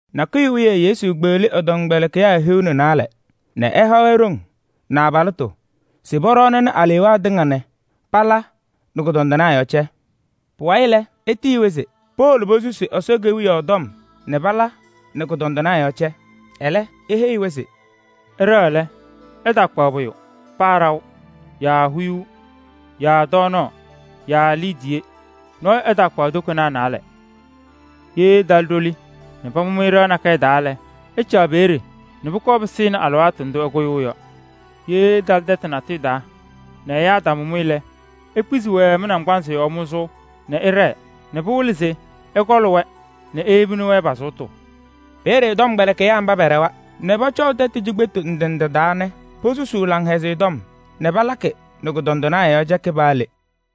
Nakʋyʋ wiye Yesu kpeɣli ɛ-tɔmkpɛlɩkɩyaa hiu nɛ naalɛ nɛ ɛha-wɛ ɖoŋ nɛ abalɩtʋ se pɔɖɔɔnɩnɩ alewaa tɩŋa nɛ pala nɛ kʋdɔndɩnaa yɔɔ cɛ. Pʋwayɩ lɛ, etiyi-wɛ se powolo posusi Ɛsɔ Kewiyaɣ tɔm nɛ pala nɛ kʋdɔndɩnaa yɔɔ cɛ. Ɛlɛ eheyi-wɛ se: “Ɩɖɛɣ lɛ, ɩtaakpaɣ pʋyʋ: paa ɖaʋ yaa huyuu yaa tɔɔnaɣ yaa liidiye. Nɔɔyʋ ɛtaakpaɣ tokonaa naalɛ. Ye ɩtalɩ ɖoli nɛ pamʋ-mɩ ɖɩɣa nakɛyɛ taa lɛ, ɩcaɣ peeye nɛ pʋkɔɔ pɩsɩnɩ alɩwaatʋ ndʋ ɩkʋyʋʋ yɔ. Ye ɩtalɩ tɛtʋ natʋyʋ taa nɛ ɛyaa ɛtamʋ-mɩ lɛ, ikpizi-wɛ mɩ-naŋgbanzɩ yɔɔ mʋzʋʋ nɛ ɩɖɛɛ nɛ pɩwɩlɩ se ɩkɔɔlɩ-wɛ nɛ iyebi-wɛ nɛ pa-sʋʋtʋ. Peeye tɔmkpɛlɩkɩyaa mba pɛɖɛwa nɛ pɔcɔʋ tɛtʋ cikpetu ndɩ ndɩ taa nɛ posusuu Laŋhɛzɩyɛ Tɔm nɛ palakɩ nɛ kʋdɔndɩnaa yɔɔ cɛkɩ paa le.”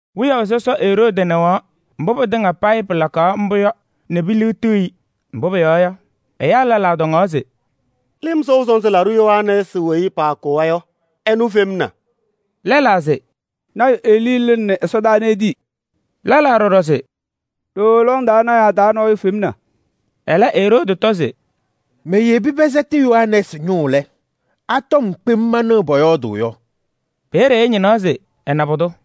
Wiyaʋ sɔsɔ Eroodi nɩɣaɣ mbʋ pɩtɩŋa pɩlakaɣ mbʋ yɔ nɛ piliɣtiɣ-i. Mbʋ pʋyɔɔ yɔ, ɛyaa lɛlaa tɔŋaɣ se: “Lɩm Sɔʋ Sɔnzɩ Laɖʋ Yohanɛɛsɩ weyi paakʋwa yɔ efemna.” Lɛlaa se: “Lɔɔyaɣ tʋ Elii lɩnɩnɩ ɛsɔdaa nɛ etii.” Lɛlaa ɖɔɖɔ se: “Ɖooo lɔŋ taa lɔɔyɩsɩ tɩnaa taa nɔɔyʋ femna.” Ɛlɛ Eroodi tɔ se: “Meyebi pɛsɛtɩ Yohanɛɛsɩ ñʋʋ lɛ, a-tɔm kpem manɩɣ pɔyɔɔdʋʋ yɔ?” Peeye ɛñɩnaɣ se ɛna pʋdʋ.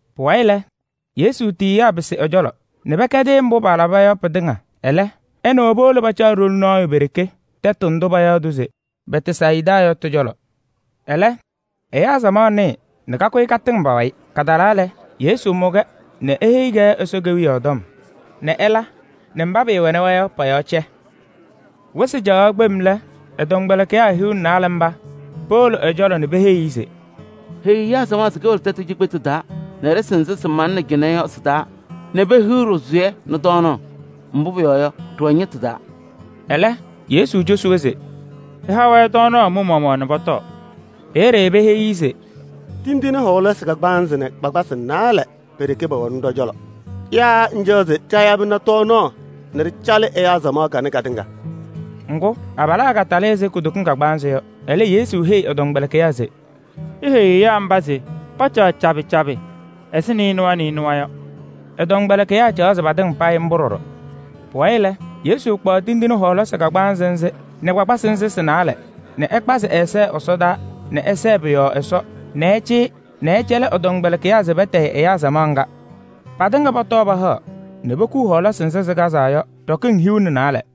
Pʋwayɩ lɛ, Yesu tiyiyaa pɩsɩ ɛ-cɔlɔ nɛ pɛkɛdɩ-ɩ mbʋ palaba yɔ pɩtɩŋa. Ɛlɛ ɛ nɛ wɛ powolo pacaɣ ɖoli nɔɔyʋ pe-ɖeke tɛtʋ ndʋ payaɣ se Bɛtsayɩda yɔ tɩ-cɔlɔ. Ɛlɛ, ɛyaa samaɣ nɩɩ nɛ pakʋyɩ patɩŋ pa-wayɩ. Patalaa lɛ, Yesu mʋ-wɛ nɛ eheyi-wɛ Ɛsɔ Kewiyaɣ tɔm nɛ ɛla nɛ mba pɩɩwɛnɩ-wɛ yɔ pɔ-yɔɔ cɛ. Wɩsɩ caɣaɣ tɛm lɛ, ɛ-tɔmkpɛlɩkɩyaa hiu nɛ naalɛ mba powolo ɛ-cɔlɔ nɛ peheyi-i se: “Heyi ɛyaa samaɣ nɛ powolo tɛtʋ cikpetu taa nɛ tɛyɛ yɔɔ nɛ pehiɣ ɖɩsʋyɛ nɛ tɔɔnaɣ. Mbʋ pʋyɔɔ yɔ, ɖɩwɛ ñɩtʋ taa.” Ɛlɛ Yesu cosi-wɛ se: “Ɩha-wɛ tɔɔnaɣ mɩ-maɣmaɣ nɛ pɔtɔɔ.” Peeye peheyi-i se: “Tindine kagbaanzɩ nɛ kpakpasɩ naalɛ pe-ɖeke pɛwɛnɩ ɖɔ-cɔlɔ. Yaa ŋcaɣ se ɖayabɩnɩ tɔɔnaɣ nɛ ɖɩcalɩ ɛyaa samaɣ kanɛ katɩŋa?” Ŋgʋ, abalaa katalɩ ɛzɩ kudokiŋ kagbaanzɩ yɔ. Ɛlɛ Yesu heyi ɛ-tɔmkpɛlɩkɩyaa se: “Iheyi ɛyaa mba se pacaɣ cabɩ cabɩ ɛzɩ nɩɩnʋwa nɩɩnʋwa yɔ.” Ɛ-tɔmkpɛlɩkɩyaa caɣzɩ patɩŋa payɩ mbʋ ɖɔɖɔ. Pʋwayɩ lɛ, Yesu kpaɣ tindine ana a-kagbaanzɩ nɛ kpakpasɩ nzɩ sɩ-naalɛ nɛ ɛkpazɩ ɛ-ɛza ɛsɔdaa nɛ ɛsɛɛ pʋ-yɔɔ Ɛsɔ nɛ ɛcɩyɩ nɛ ɛcɛlɩ ɛ-tɔmkpɛlɩkɩyaa se patayɩ ɛyaa samaɣ ŋga. Patɩŋa pɔtɔɔ pahaɣ nɛ pokuu hɔɔlasɩ nzɩ sɩkazaa yɔ ɖɔkɩŋ hiu nɛ naalɛ.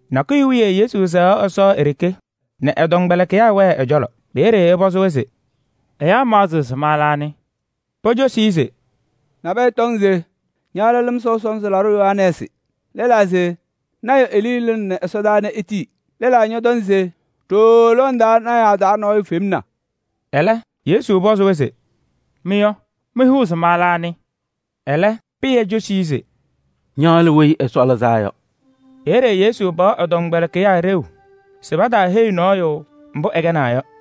Nakʋyʋ wiye Yesu sɛɣaɣ Ɛsɔ e-ɖeke nɛ ɛ-tɔmkpɛlɩkɩyaa wɛɛ ɛ-cɔlɔ. Peeye ɛpɔzɩ-wɛ se: “Ɛyaa maɣzɩɣ se ma lɛ anɩ?” Pocosi-i se: “Nabɛyɛ tɔŋ se ña lɛ Lɩm Sɔʋ Sɔnzɩ Laɖʋ Yohanɛɛsɩ. Lɛlaa se lɔɔyaɣ tʋ Elii lɩnɩnɩ ɛsɔdaa nɛ etii. Lɛlaa ñɔtɔŋ se ɖooo lɔŋ taa lɔɔyɩsɩ tɩnaa taa nɔɔyʋ femna.” Ɛlɛ Yesu pɔzɩ-wɛ se: “Mɩ yɔ, mɩhʋʋ se ma lɛ anɩ?” Ɛlɛ Pɩyɛ cosi-i se: “Ña lɛ Weyi Ɛsɔ Lɩzaa Yɔ.” Peeye Yesu paɣ ɛ-tɔmkpɛlɩkɩyaa ɖeu se pataaheyi nɔɔyʋ mbʋ ɛkɛnaa yɔ.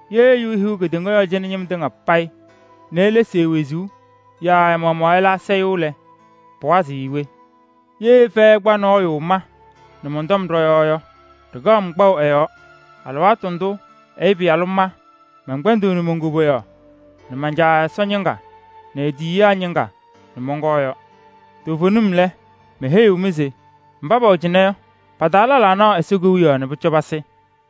Ye ɛyʋ ehiɣ kedeŋa yɔɔ cɩnɛ ñɩm tɩŋa payɩ nɛ elesi e-wezuu yaa ɛ-maɣmaɣ ɛla asayʋʋ lɛ, pɩwazɩɣ-ɩ we? Ye fɛyɛ ɛkpa nɔɔyʋ ma nɛ mɔn-tɔm ɖɔ-yɔɔ yɔ, ɖɩkaɣ-m kpaʋ ɛ-yɔɔ alɩwaatʋ ndʋ Ɛyʋ Pɩyalʋ ma mɛnkpɛndɩɣnɩ mon-koboyaɣ nɛ man-Caa Ɛsɔ ñɩŋga nɛ e-tiyiyaa ñɩŋga nɛ mɔnkɔɔ yɔ. Toovenim lɛ, meheyiɣ-mɩ se mba pɛwɛ cɩnɛ yɔ, pa-taa lɛlaa naɣ Ɛsɔ Kewiyaɣ nɛ pʋcɔ pasɩ.”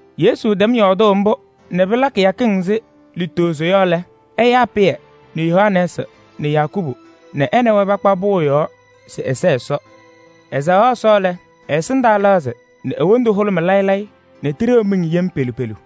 Yesu tɛm yɔɔdʋʋ mbʋ nɛ pɩla kɩyakɩŋ ɛzɩ lutozo yɔ lɛ, ɛyaa Pɩyɛ nɛ Yohanɛɛsɩ nɛ Yakubu nɛ ɛ nɛ wɛ pakpa pʋʋ yɔɔ se ɛsɛɛ Ɛsɔ. Ɛsɛɣaɣ Ɛsɔ lɛ, ɛ-ɛsɩndaa lɛɣzɩ nɛ e-wondu hʋlʋmɩ layɩ layɩ nɛ tiɖeɣ miŋ yem pelu pelu.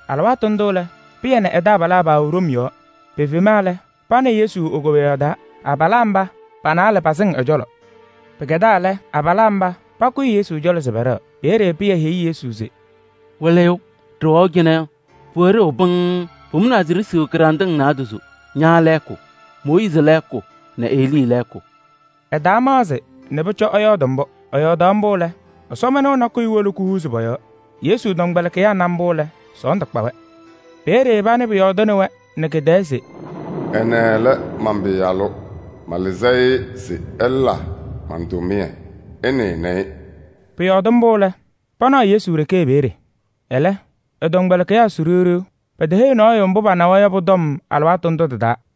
Alɩwaatʋ ndʋ lɛ, Pɩyɛ nɛ ɛ-taabalaa paawɛ ɖom yɔɔ. Pefema lɛ, pana Yesu e-koboyaɣ taa, abalaa mba pa-naalɛ pasɩŋ ɛ-cɔlɔ. Pɩkɛdaa lɛ, abalaa mba pakʋyɩ Yesu cɔlɔ se pɛɖɛɣ. Peeye Pɩyɛ heyi Yesu se: “Wɩlɩyʋ! Ɖɩwɛʋ cɩnɛ yɔ, pʋwɛ ɖeu pɩŋŋ. Pʋmʋnaa se ɖisiɣ kɩɖanɖɩŋ naadozo: ña lɛɛkʋ, Mooyiizi lɛɛkʋ nɛ Elii lɛɛkʋ.” Ɛtaamaɣzɩ nɛ pʋcɔ ɛyɔɔdɩ mbʋ. Ɛyɔɔdaɣ mbʋ lɛ, ɛsɔmɩnʋʋ nakʋyʋ wolo kuhuuzi pɔ-yɔɔ. Yesu tɔmkpɛlɩkɩyaa na mbʋ lɛ, sɔɔndʋ kpa-wɛ. Peeye panɩ pʋyɔɔdʋʋnɩ-wɛ nɛ kɩ-tɛɛ se: “Ɛnɛ lɛ man-Pɩyalʋ. Malɩzɩ-ɩ se ɛla man-tʋmɩyɛ, ɩnɩnɩ-ɩ.” Pʋyɔɔdɩ mbʋ lɛ, panaɣ Yesu ɖeke peeye. Ɛlɛ, ɛ-tɔmkpɛlɩkɩyaa su ɖiɣ ɖiɣ, peteheyi nɔɔyʋ mbʋ panawa yɔ pʋ-tɔm alɩwaatʋ ndʋ tɩ-taa.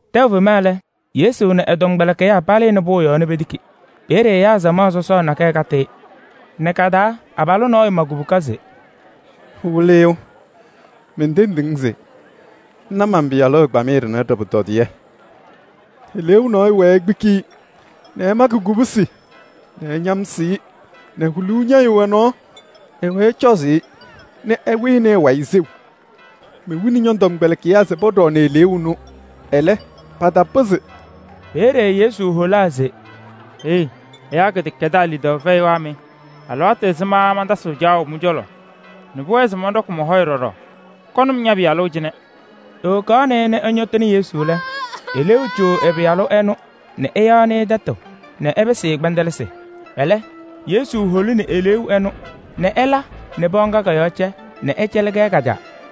Tɛʋ fema lɛ, Yesu nɛ ɛ-tɔmkpɛlɩkɩyaa palɩnɩ pʋʋ yɔɔ nɛ petiki. Peeye ɛyaa samaɣ sɔsɔɔ nakɛyɛ katɩ-ɩ nɛ ka-taa abalʋ nɔɔyʋ ma kubuka se: “Wɩlɩyʋ! Mentendiɣ-ŋ se ŋna man-pɩyalʋ ɛgbamɩyɛ ɖɩnɛ ɖɩ-pʋtɔdɩyɛ. Eleeu nɔɔyʋ wɛɛ ekpiki-i nɛ ɛmakɩ kobusi nɛ ɛñamsɩɣ-ɩ nɛ huluu ñɛyɩɣ ɛ-nɔɔ. Ɛwɛɛ ɛcɔzʋʋ-ɩ nɛ ɛwɩɣnɩ ɛ-wayɩ seu. Mewini ñɔ-tɔmkpɛlɩkɩyaa se pɔɖɔɔnɩ eleeu ɛnʋ, ɛlɛ, patapɩzɩ.” Peeye Yesu holaa se: “Heyi! Ɛyaa kɩdɛkɛdaa lidaʋ fɛyɩwaa mɩ! Alɩwaatʋ ɛzɩma mantasɩɣ mɩ-cɔlɔ caɣʋ nɛ pʋwɛɛ se mɔnɖɔkɩ mɔ-hɔyɛ ɖɔɖɔ? Kɔnɩ-m ña-pɩyalʋ cɩnɛ.” Ewokaɣnɩ-ɩ nɛ ɛñɔtɩnɩ Yesu lɛ, eleeu co ɛ-pɩyalʋ ɛnʋ nɛ ɛyaɣnɩ tɛtʋ nɛ ɛpɩsɩ-ɩ kpɛndɛlɩsɩ. Ɛlɛ, Yesu holini eleeu ɛnʋ nɛ ɛla nɛ pɩɣa ŋga kɔ-yɔɔ cɛ nɛ ɛcɛlɩ-kɛ ka-caa.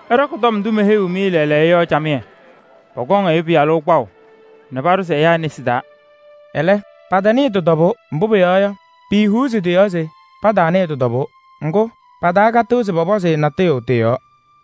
“Ɩɖɔkɩ tɔm ndʋ meheyiɣ-mɩ lɛɛlɛɛyɔ yɔ camɩyɛ. Pɔkɔŋ Ɛyʋ Pɩyalʋ kpaʋ nɛ paɖʋzɩ ɛyaa nesi taa.” Ɛlɛ, patanɩɩ tɩ-tɔbʋʋ, mbʋ pʋyɔɔ yɔ, piihuuzi tɩ-yɔɔ se pataanɩɩ tɩ-tɔbʋʋ. Ŋgʋ, patakatɩɣ se pɔpɔzɩ-ɩ natʋyʋ tɩ-yɔɔ.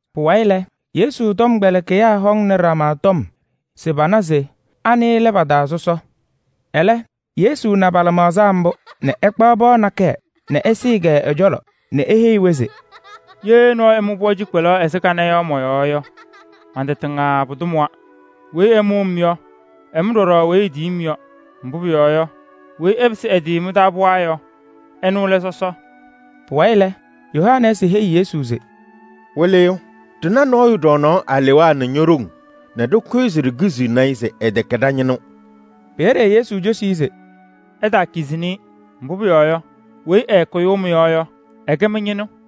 Pʋwayɩ lɛ, Yesu tɔmkpɛlɩkɩyaa hɔŋnɩ ɖama tɔm se pana se anɩ lɛ pa-taa sɔsɔ. Ɛlɛ Yesu na pa-lɩmaɣza mbʋ nɛ ɛkpaɣ pɩɣa nakɛyɛ nɛ ɛsɩɩ-kɛ ɛ-cɔlɔ nɛ eheyi-wɛ se: “Ye nɔɔyʋ ɛmʋ pɩɣa cikpelaɣ ɛzɩ kanɛ yɔ mɔ-yɔɔ yɔ, man-tɩ tɩŋa pʋdʋ mʋwa. Weyi ɛmʋ-m yɔ, ɛmʋ ɖɔɖɔ weyi etiyi-m yɔ. Mbʋ pʋyɔɔ yɔ, weyi ɛpɩsɩ ɛ-tɩ mɩ-taa pɩɣa yɔ, ɛnʋ lɛ sɔsɔ.” Pʋwayɩ lɛ, Yohanɛɛsɩ heyi Yesu se: “Wɩlɩyʋ, ɖɩna nɔɔyʋ ɖɔɔnaɣ alewaa nɛ ño-ɖoŋ nɛ ɖɩkʋyɩ se ɖikiziɣni-i se ɛtɛkɛ ɖa-ñɩnʋ.” Peeye Yesu cosi-i se: “Ɩtaakizini-i, mbʋ pʋyɔɔ yɔ, weyi ɛɛkʋyʋʋ mɩ-yɔɔ yɔ, ɛkɛ mɩ-ñɩnʋ.”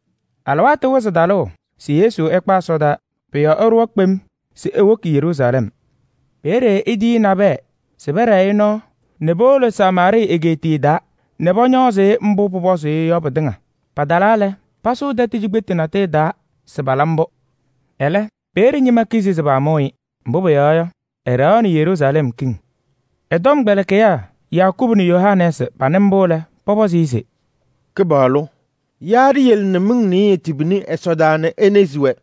Alɩwaatʋ wɩzɩ talʋʋ se Yesu ɛkpa ɛsɔdaa. Pʋ-yɔɔ ɛɖʋwa kpem se ewoki Yeruusalɛm. Peeye etiyi nabɛyɛ se pɛɖɛɛ-ɩ nɔɔ nɛ powolo Samaarɩɩ egeetiye taa nɛ pɔñɔɔzɩ-ɩ mbʋ pʋpɔzʋʋ-ɩ yɔ pɩtɩŋa. Patalaa lɛ, pasʋʋ tɛtʋ cikpetu natʋyʋ taa se pala mbʋ. Ɛlɛ, peeye ñɩma kizi se paamʋʋ-ɩ, mbʋ pʋyɔɔ yɔ, ɛɖɛɣaɣnɩ Yeruusalɛm kiŋ. Ɛ-tɔmkpɛlɩkɩyaa Yakubu nɛ Yohanɛɛsɩ panɩ mbʋ lɛ, pɔpɔzɩ-ɩ se: “Kɩpaɣlʋ! Yaa ɖiyele nɛ miŋ nɩɩyɩ tibini ɛsɔdaa nɛ enezi-wɛ?”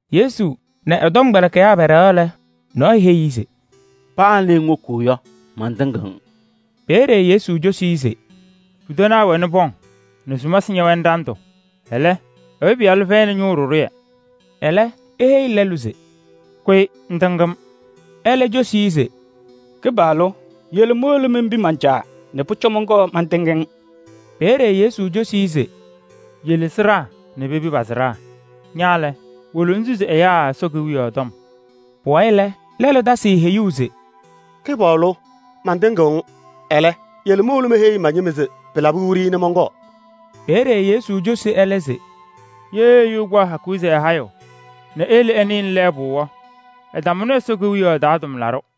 Yesu nɛ ɛ-tɔmkpɛlɩkɩyaa pɛɖɛɣaɣ lɛ, nɔɔyʋ heyi-i se: “Paa le ŋwoki yɔ, mantɩŋɩɣ-ŋ.” Peeye Yesu cosi-i se: “Pudanaa wɛnɩ pɔŋ nɛ sumasɩ ñɛwɛnɩ ɖandʋ, ɛlɛ, Ɛyʋ Pɩyalʋ fɛyɩnɩ ñʋʋ ɖɩɖʋyɛ.” Ɛlɛ eheyi lɛlʋ se: “Kʋyɩ ŋtɩŋ-m.” Ɛlɛ cosi-i se: “Kɩpaɣlʋ! Yele mowolo menpi man-caa nɛ pʋcɔ mɔnkɔɔ mantɩŋ-ŋ.” Peeye Yesu cosi-i se: “Yele sɩɖaa nɛ pepi pa-sɩɖaa. Ña lɛ, wolo ŋsusi ɛyaa Ɛsɔ Kewiyaɣ tɔm.” Pʋwayɩ lɛ, lɛlʋ tasɩ-ɩ heyuu se: “Kɩpaɣlʋ! Mantɩŋɩɣ-ŋ. Ɛlɛ, yele mowolo meheyi ma-ñɩma se pɩlabɩ wiɖiyi nɛ mɔnkɔɔ.” Peeye Yesu cosi ɛlɛ se: “Ye ɛyʋ ɛkpaɣ hakuu se ɛhayɩɣ nɛ eyele ɛnɩɣnɩ lɛɛbʋ yɔ, ɛtamʋnɩ Ɛsɔ Kewiyaɣ taa tʋmlaɖʋ.”